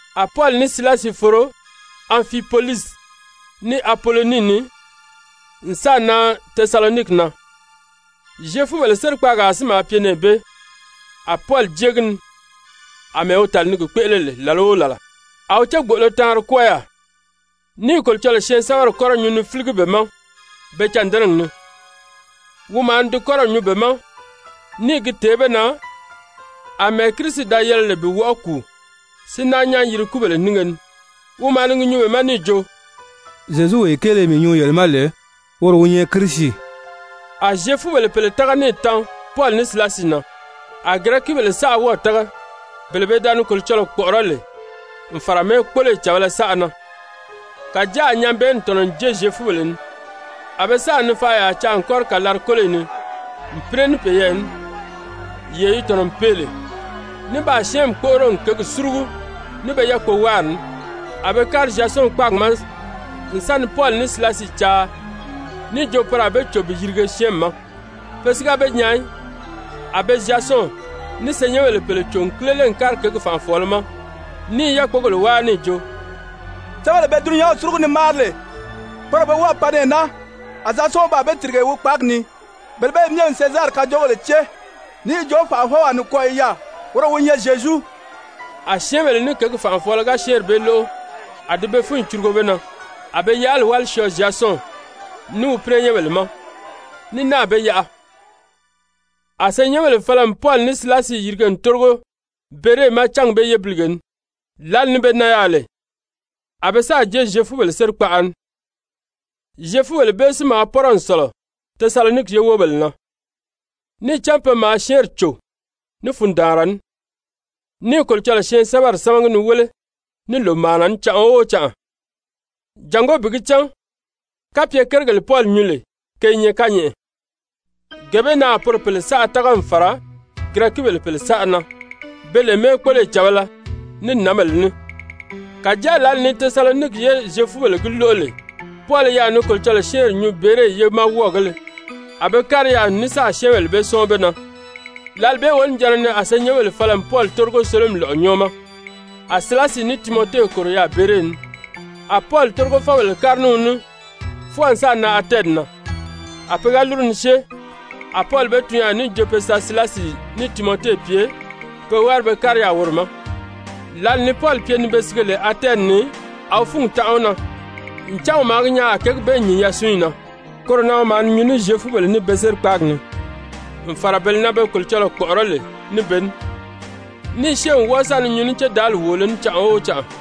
A Pɔli ní Silasi foro Anfipolisi, ní Apolonii ni n sáà nan Tesaloniki na, Zyefubèle sérikpaagaa si maa pye nɛɛ bee. A Pɔli jée gi ni àmɛɛ wi tàli ni gi kpéʔele lè làla o làla. A wi cégboʔolo taanri kwɔ́ɔ yaà, ní i Kolocɔlɔɔ syɛɛnsɛbɛri kɔ́rɔ nyuu ni fíligi be ma be cândɛnɛgi ni. Wi maa ni di kɔ́rɔw nyuu be ma ní i gi tèé be na àmɛɛ Kirisi da yɛlɛ lè bi wɔʔɔ kùu si náa nyán yiri kúbèle nínge ni. Wi maa ni gi nyuu be ma níì jo: «Zyezuwee kéele mii nyuu yele ma lè, woro wi nyɛ Kirisi.» A Zyefubèle pèle tága níì tan Pɔli ní Silasi na, a Girɛkibèle saʔa wɔ́ɔ̀ tága, bele pe da ni Kolocɔlɔɔ kpɔ̀ʔɔrɔ́ lè n fàra mɛ́ɛkpoloyi càbala saʔa na. Kàjáa a nyabɛɛnni tɔ̀nɔ n jée Zyefubèle ni, a be sáà nifaʔayaa caa n kɔ́ri kàlari-kóloyi ni n pínɛ ní peyɛɛ ní, yee yi tɔ̀nɔ n pee lè, ní baa syɛ́ɛnmi kpóʔoro n kěgi súrugu ní be yákpowáari ní. A be kári Zyasɔn kpáagi ma n sa ni Pɔli ní Silasi caa níì jo poro a be cò bi yirige syɛ́ɛnmi ma. Pe si ga be nyaa í. A be Zyasɔn ní senyɛnbèle pèle cò n kílele n kári kěgi fànʔafɔɔlɔ ma ní i yákpogèle wáa níì jo: «Syɛ́ɛnbèle be dulunyanw súrugu ni máari lè, poro be wɔ́ɔ̀ pan nɛɛ naa, a Zyasɔn baa be tìrige wi kpáagi ni. Bele bee myɛ n Sezari kajoogèle cée níì jo fànʔafɔwaa nikwɔɔ i yaà, woro wi nyɛ Zyezu.» A syɛ́ɛnbèle ní kěgi fànʔafɔɔlɔ ga syɛ́ɛnri bee lóʔo, a di be fúnyi curugo be na. A be yaʔali wáli syɔɔ Zyasɔn ní wi pínɛnyɛnbèle ma, ní náà be yaʔa. A senyɛnbèle fala n Pɔli ní Silasi yirige n tórigo Bere ma cángi bee yébilige ni. Lǎli ni be nan yaà lè, a be sáà jée Zyefubèle sérikpaʔa ni. Zyefubèle bee si maa pɔ́rɔ n sɔ̀lɔ Tesaloniki ye wóbèle na, níì cán pe maa syɛ́ɛnri cò ní fundaanra ní, ní i Kolocɔlɔɔ syɛɛnsɛbɛri sámagi ni wéle ní lòmaana ní canʔa o canʔa, jàngó bi gi cán kapye kérigèle Pɔli nyuu lè ke i nyɛ kányɛʔɛ. Gee bee na a poro pèle saʔa tága n fàra Girɛkibèle pèle saʔa na, be lè mɛ́ɛkpoloyi càbala ní nǎnbèle ní. Kàjáa lǎli ni Tesaloniki ye Zyefubèle gi lóʔo lè Pɔli i yaà ni Kolocɔlɔɔ syɛ́ɛnri nyuu Bere ye ma wɔ́ɔgēle, a be kári yaà n ní sáà syɛ́ɛnbèle bee sɔ́ɔn be na. Lǎli bee wonijanna ni a senyɛnbèle fala n Pɔli tórigo sólomi lɔ̀ʔɔ nyɔ́ɔ ma. A Silasi ní Timɔte kòro yaà Bere ni. A Pɔli tórigofɔbèle kári ní wi ní fwɔɔ n sáà nan Atɛni na. A pe ga lúru ni syée, a Pɔli be tun yaà níì jo be sa Silasi ní Timɔte pye pe wári be kári yaà woro ma. Lǎli ni Pɔli pye ni be sige lè Atɛni ni, a wi fúngi tanʔa wi na, ncan wi maa gi nyaa a kěgi bee nyìn yasunyi na. Koro na wi maa ni nyuu ní Zyefubèle ní be sérikpaagi ni, n fàra bele na pe da ni Kolocɔlɔɔ kpɔ̀ʔɔrɔ́ lè ní be ní, ní i syée n wɔ́ɔ sa ni nyuu ní cédaali wòolo ní canʔa o canʔa.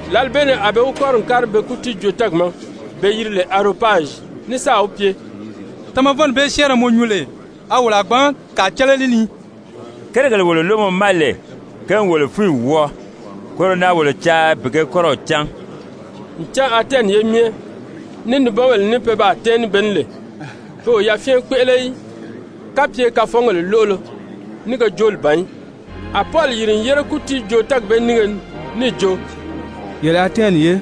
Lǎli bee ni a be wi kɔ́ri n kári be kútiijoo-tɛ́ɛgi ma be yiri lè Aropazyi, ní sáà wi pye: «Tamavɔnni bee syɛ́ɛnrɛ mɔ nyuu lè, a wolo a gbǎn kàa cán lé li ni? Kérigèle wolo lóʔo mɔ ma lè, ke n wolo fúnyi wɔ́ɔ. Koro na wolo caa bi ge kɔ́rɔw cán.» Ncan Atɛni ye myɛ, ní nibɔnbèle ní pe baa tɛ́ɛn ní be ní lè, pe o yafyɛn kpéʔele í kapye kafɔngèle lóʔolo ní ge jooli ban í. A Pɔli yìri n yére kútiijoo-tɛ́ɛgi bee nínge ni níì jo: «Yele Atɛni ye,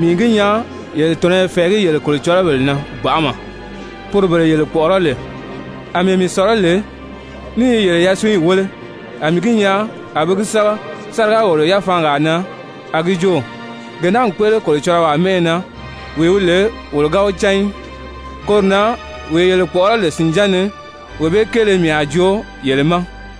mii n gi nyaa yele tɔ̀nɔ i fɛ̀ɛgí yele kolocɔlɔbèle na gbanʔama, poro bele yele kpɔ̀ʔɔrɔ́ lè. Amɛɛ mii sɔ̀lɔ́ lè ní i yele yasunyi wéle, a mii gi nyaa a be gi sɛ́bɛ sáriga-wòlo-yafaangaa na a gi jo: ‹Gee naa n kpéʔele kolocɔlɔwaa mɛ́ʔɛ na, wee wi lè wolo ga wi cán í.› Koro na wee yele kpɔ̀ʔɔrɔ́ lè sìnján ni, wee bee kéele mii a joo yele ma.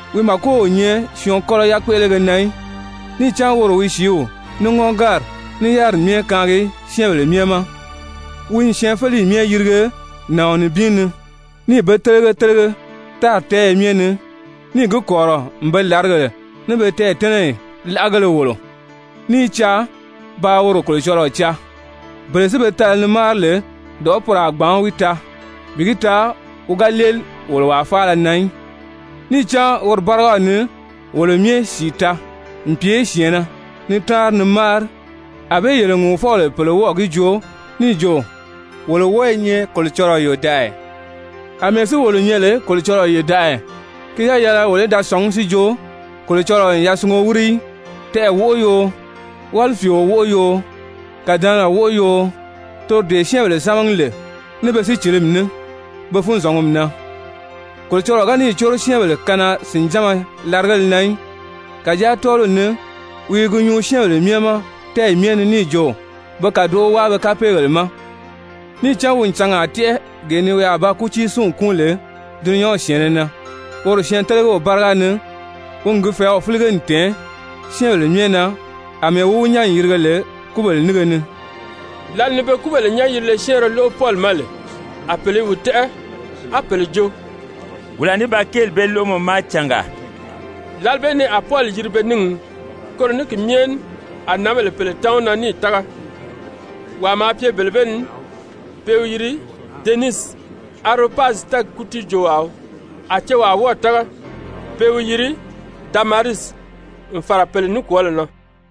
Wi màko o nyɛ syɔɔn kɔ́lɔ yakpéʔelege na í, níì cán woro wi sìíw, ní ŋɔ́ngari, ní yáriri myɛ kaangi syɛ́ɛnbèle myɛ ma. Wi n syɛɛnfeleyi myɛ yirige nàɔn nibin ni, níì be télege télege tári tɛ́ɛyɛ myɛ ni, níì gi kɔ̀rirɔ n be làrigèle ní be tɛɛ̀tɛ́nɛyi láʔagéle wòlo, ní i caa paa woro Kolocɔlɔɔ caa. Bele si be tala ni máari lè, dɔ̀ʔɔ́ poro a gbǎn wi taa, bi gi taa wi ga léeli wolo wàa faala na í. Níì cán woro bárigaw ni wolo myɛ sìi taa n pye syɛ̀ɛnnɛ, ni táanri ni máari. Anbée yele ŋùuvɔbèle pèle wɔ́ɔ̀ gi joo níì jo: ‹Wolo wɔ́ɔ i nyɛ Kolocɔlɔɔ yòdaʔaya.› Amɛɛ si wolo nyɛ lè Kolocɔlɔɔ yòdaʔaya, ki ga yɛlɛ wolo í da sɔ̀ngí si jo Kolocɔlɔɔ n yasungo wíri í, tɛɛ̀ wóʔo yoo, wálifiio wóʔo yoo, kàdɛnɛgɛ wóʔo yoo, toro dee syɛ́ɛnbèle sámagi lè ní be sícilimi ní, be funzɔngumi na. Kolocɔlɔɔ ga níì córo syɛ́ɛnbèle kanaa-sìnjánma larigéle na í, kàjáa tɔ́ɔliw ni wi i gi nyuu syɛ́ɛnbèle myɛ ma tɛ́ɛyi myɛ ni níì jo be kàdoʔo wáa be kapeegèle ma. Níì cán wi n cangaa tɛ́ʔɛ gee ni wi a ba kútiisinw kúun lè dulunyanw syɛ̀ɛnnɛ na woro syɛɛntelegew báriga ni, wi n gi fɛ̀ɛ́w fílige n tɛ̀ɛn syɛ́ɛnbèle myɛ na àmɛɛ wi wi nyán n yirige lè kúbèle nínge ni.» Lǎli ni be kúbèle nyán-yirile syɛ́ɛnrɛ lóʔo Pɔli ma lè, a pèle i wi tɛ́ʔɛ, á pèle jo: «Wolo a ní ba kéeli bee lóʔo mɔ ma cangaa.» Lǎli bee ni a Pɔli yiri be níngi ni. Koro ní ki myɛ ní a nǎnbèle pèle tan wi na níì tága. Wàa maa pye bele bee ni pe i wi yiri Denisi, Aropazyi tɛ́ɛgi kútiijoowaa wii, a cewaa wɔ́ɔ̀ tága, pe i wi yiri Damarisi, n fàra pèle nikwɔɔlɔ na.